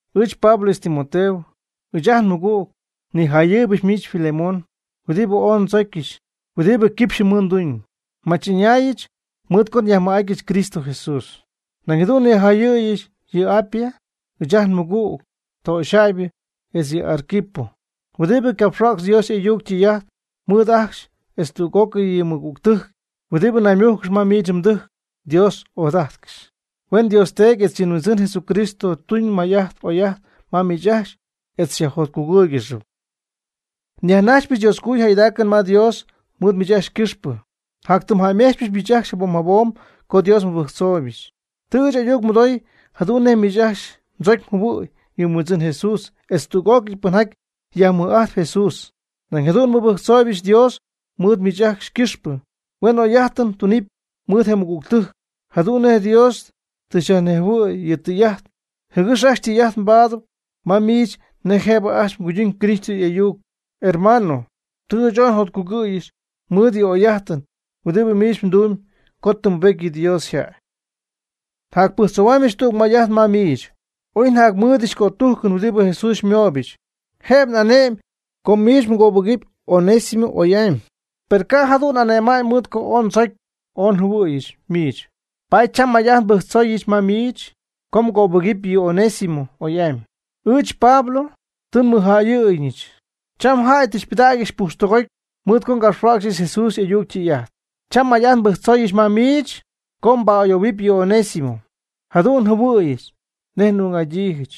Ɨɨch Pablo etz Timoteo, ɨɨch ajt nmɨgüg, nijayɨɨybɨch miich Filemón huɨdibɨ ooy ndzocyɨch, huɨdibɨ quipxyɨ mɨɨd nduunɨm. Nmach'ɨñäyɨch mɨɨd co nyajmɨj'atyɨch Cristo Jesús. Nañ jadu'n nijayɨɨybɨch yɨ Apía, ɨɨch ajt nmɨgüg töxyjäybɨ, etz yɨ Arquipo, huɨdibɨ capxhuäcx Dios y'ayuc tú'cɨy mɨɨd ɨɨch ajcxy, etz tüg'ócɨy yɨ mɨgügtɨjc huɨdibɨ naymújcɨgɨxp ma miich mdɨjc Dios ojadajtcɨxy. Huen Dios Teedy etz yɨ Huindzɨn Jesucristo tuñ may'ajt oy'ajt ma miich ajcxy etz xyajjotcugɨ́ɨygɨxɨpy. Nyajnajxpyɨch Dioscojuyip ma Dios mɨɨd miich ajcxy ycɨxpɨ. Njatytɨmjäymejtzpɨch miich ajcxy jabom jabom co Dios nmɨbɨjctzooyɨch. Tɨ ɨɨch ayuc nmɨdoy jadu'n nej miich mdzocy mjɨhuɨ̈y yɨ Huindzɨn Jesús etz tüg'ócɨy pɨnjaty yajmɨj'ajtp Jesús. Nañ jadu'n nmɨbɨjctzooybɨch Dios mɨɨd miich ajcxy ycɨxpɨ, huen oyjäy'ajtɨn mdunɨpy mɨɨd je mɨgügtɨjc, jadu'n nej Dios tɨ xyajnejhuɨ̈y yɨ tɨy'ajt jɨgɨx ajcxy tɨy'ajt paadɨpy ma miich nej jëb ajcxy cuyduñ Cristo y'ayuc. Hermano, tɨ ɨɨch ooy njotcugɨ̈yɨch mɨɨd yɨ m'oyjäy'ajtɨn huɨdibɨ miich mdumyb co tɨ mbubety yɨ Dios yjäy. Njapɨjctzoohuamybɨch tüg may'ajt ma miich. Oy njamɨ́ɨdɨdyɨch cötujcɨn huɨdibɨ Jesús xymooyɨch jëb nja'ane'my co miich mgöbɨgɨpy Onésimo oy'amy. Per ca' jadu'n n'ane'ma'ñ mɨɨd co ooy ndzocy ooy njɨhuɨ̈yɨch miich. Paady cham may'ajt nbɨjctzooyɨch ma miich co mgöbɨgɨpy yɨ Onésimo oy'amy. Ɨɨch Pablo, tɨ nmɨjjäyɨɨyñɨch. Cham jäy tɨ xypɨdägyɨch pujxtɨgoty mɨɨd co ngapxhuäcxɨch Jesús y'ayuc ytɨy'ajt. Cham may'ajt nbɨjctzooyɨch ma miich co mba'ayoohuɨpy yɨ Onésimo. Jadu'n njɨhuɨ̈yɨch nej n'ung'adyiijɨch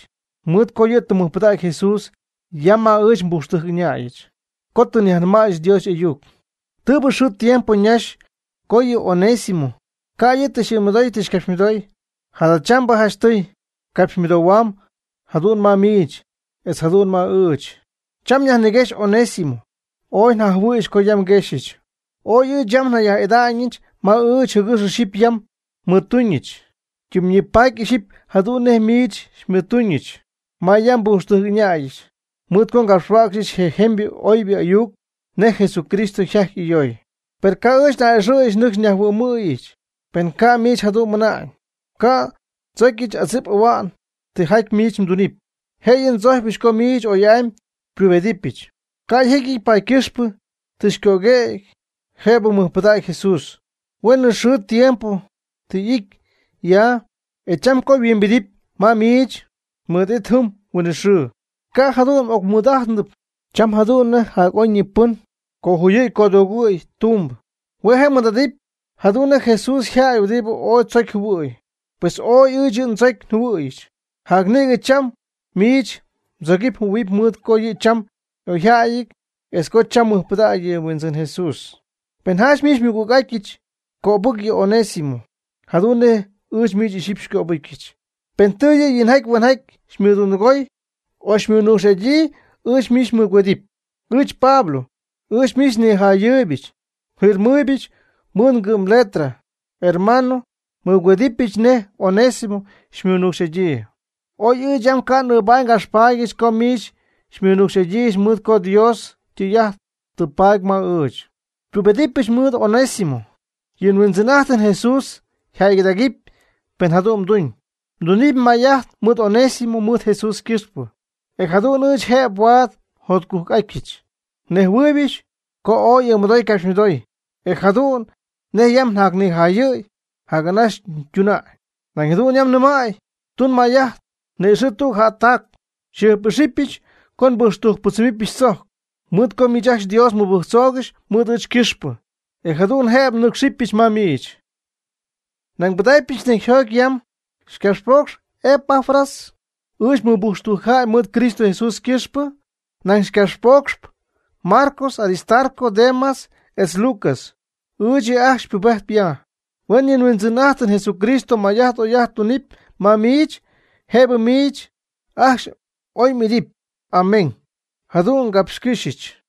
mɨɨd co yɨ' tɨ mɨjpɨdägy Jesús ya ma ɨɨch nbujxtɨjc'ɨñäyɨch co tɨ nyajnɨmäyɨch Dios y'ayuc. Tɨɨbɨ xɨɨ tiempo ñaxy co yɨ Onésimo ca' yɨ' tɨ xy'ɨɨmɨdoy tɨ xycapxymɨdoy. Jadachambɨ janchtɨy capxymɨdoohuam jadu'n ma miich etz jadu'n ma ɨɨch. Cham nyajniguexy Onésimo. Ooy njajɨhuɨ̈yɨch co yam nguexyɨch. Ooy ɨɨch yam njayaj'ida'ñɨch ma ɨɨch jɨgɨx ixyipy yam xymɨɨdtuñɨch. Ytimyñipaatpy ixyipy jadu'n nej miich xymɨɨdtuñɨch ma yam nbujxtɨjc'ɨñäyɨch mɨɨd co ngapxhuäcxyɨch je jemybɨ oybɨ ayuc nej Jesucristo yjaty ayooy. Per ca' ɨɨch n'a'ɨxɨ̈yɨch nɨcxy nyajhuɨ'myɨch, pen ca' miich jadu'n mɨna'ñ. Ca'p ndzocyɨch adzip ahua'ñ tijaty miich mdunɨpy. Jëyɨ ndzocyɨch co miich oy'amy xypubedɨpyɨch. Ca' yjecyɨty paady ycɨxpɨ tɨ xycöguëgy jëbɨ mɨjpɨdägy Jesús. Hueenɨ xɨɨ tiempo tɨ y'ity ya, e cham co yhuimbidɨpy ma miich, mɨɨd y'idɨpy jɨm huinɨxɨɨ. Ca' jadu'n m'ocmɨɨd'ajtnɨp cham jadu'n nej jac'oyñipɨn cojuyɨ̈y codoogɨ̈y tumbɨ. Hue' je' mmɨɨ'adɨp jadu'n nej Jesús yjäy huɨdibɨ ooy mdzocy mjɨhuɨ̈y. Pues ooy ɨɨch yɨ' ndzocy njɨhuɨ̈yɨch. Jac nïgɨ cham miich mdzogɨpy mjɨhuɨ̈huɨpy mɨɨd co yɨ' cham y'oyjäyɨty, etz co cham mɨjpɨdägy yɨ Huindzɨn Jesús. Pen janch miich xymɨgüg'adyiijɨch cöbɨc yɨ Onésimo jadu'n nej ɨɨch miich ixyipy xycöbɨcyɨch. Pen tɨ yɨ' yinjaty huenjaty xymɨdundɨgoy o xymɨnucx'adyii ɨɨch miich nmɨgüedɨpy. Ɨɨch Pablo, ɨɨch miich njaaybɨch nfirmajɨ̈yɨch mɨɨdɨch ngɨ'mgɨ' ngɨ'mletra. Hermano, nmɨgüedɨpyɨch nej Onésimo xymɨnucx'adyii. Oy ɨɨch yam ca' n'ɨɨbaady ngapxpaady co miich xymɨnucx'adyiijɨch mɨɨd co Dios ytɨy'ajt tɨ mbaady ma ɨɨch. Xypubedɨpɨch mɨɨd Onésimo. Yɨ nHuindzɨn'ajtɨm Jesús yjäygɨdägɨpy pen jadu'n mduñ. Mdunɨpy may'ajt mɨɨd Onésimo mɨɨd Jesús ycɨxpɨ, e jadu'n ɨɨch jëb huaad njotcujc'atyɨch. Nnejhuɨɨybɨch co ooy m'ɨɨmɨdoy mgapxmɨdoy, e jadu'n nej yam njacnijayɨ̈y, jac'anaxy mduna'ñ. Nañ jadu'n yam nɨmäy. Tun may'ajt ni'ixɨ̈ tüg jättac. Njɨjp'ijxypɨch co nbujxtɨjcpɨdzɨmɨpyɨch tzojc mɨɨd co miich ajcxy Dios mɨbɨjctzoogɨxy mɨɨd ɨɨch ycɨxpɨ, e jadu'n jëbɨ nɨ́cxɨbɨch ma miich. Nañ nbɨdacpyɨch necyjoty yam. Xycapxpoocxp Epafras ɨɨch nmɨbujxtɨjc jäy mɨɨd Cristo Jesús ycɨxpɨ. Nañ xycapxpoocx Marcos, Aristarco, Demas etz Lucas. Ɨɨch yɨ' ajcxy xypubejtp ya. Huen yɨ nHuindzɨn'ajtɨm Jesucristo may'ajt oy'ajt tunɨpy ma miich ajcxy, jëb miich ajcxy oy m'ity. Amén. Jadu'n ngapxcɨ́xyɨch.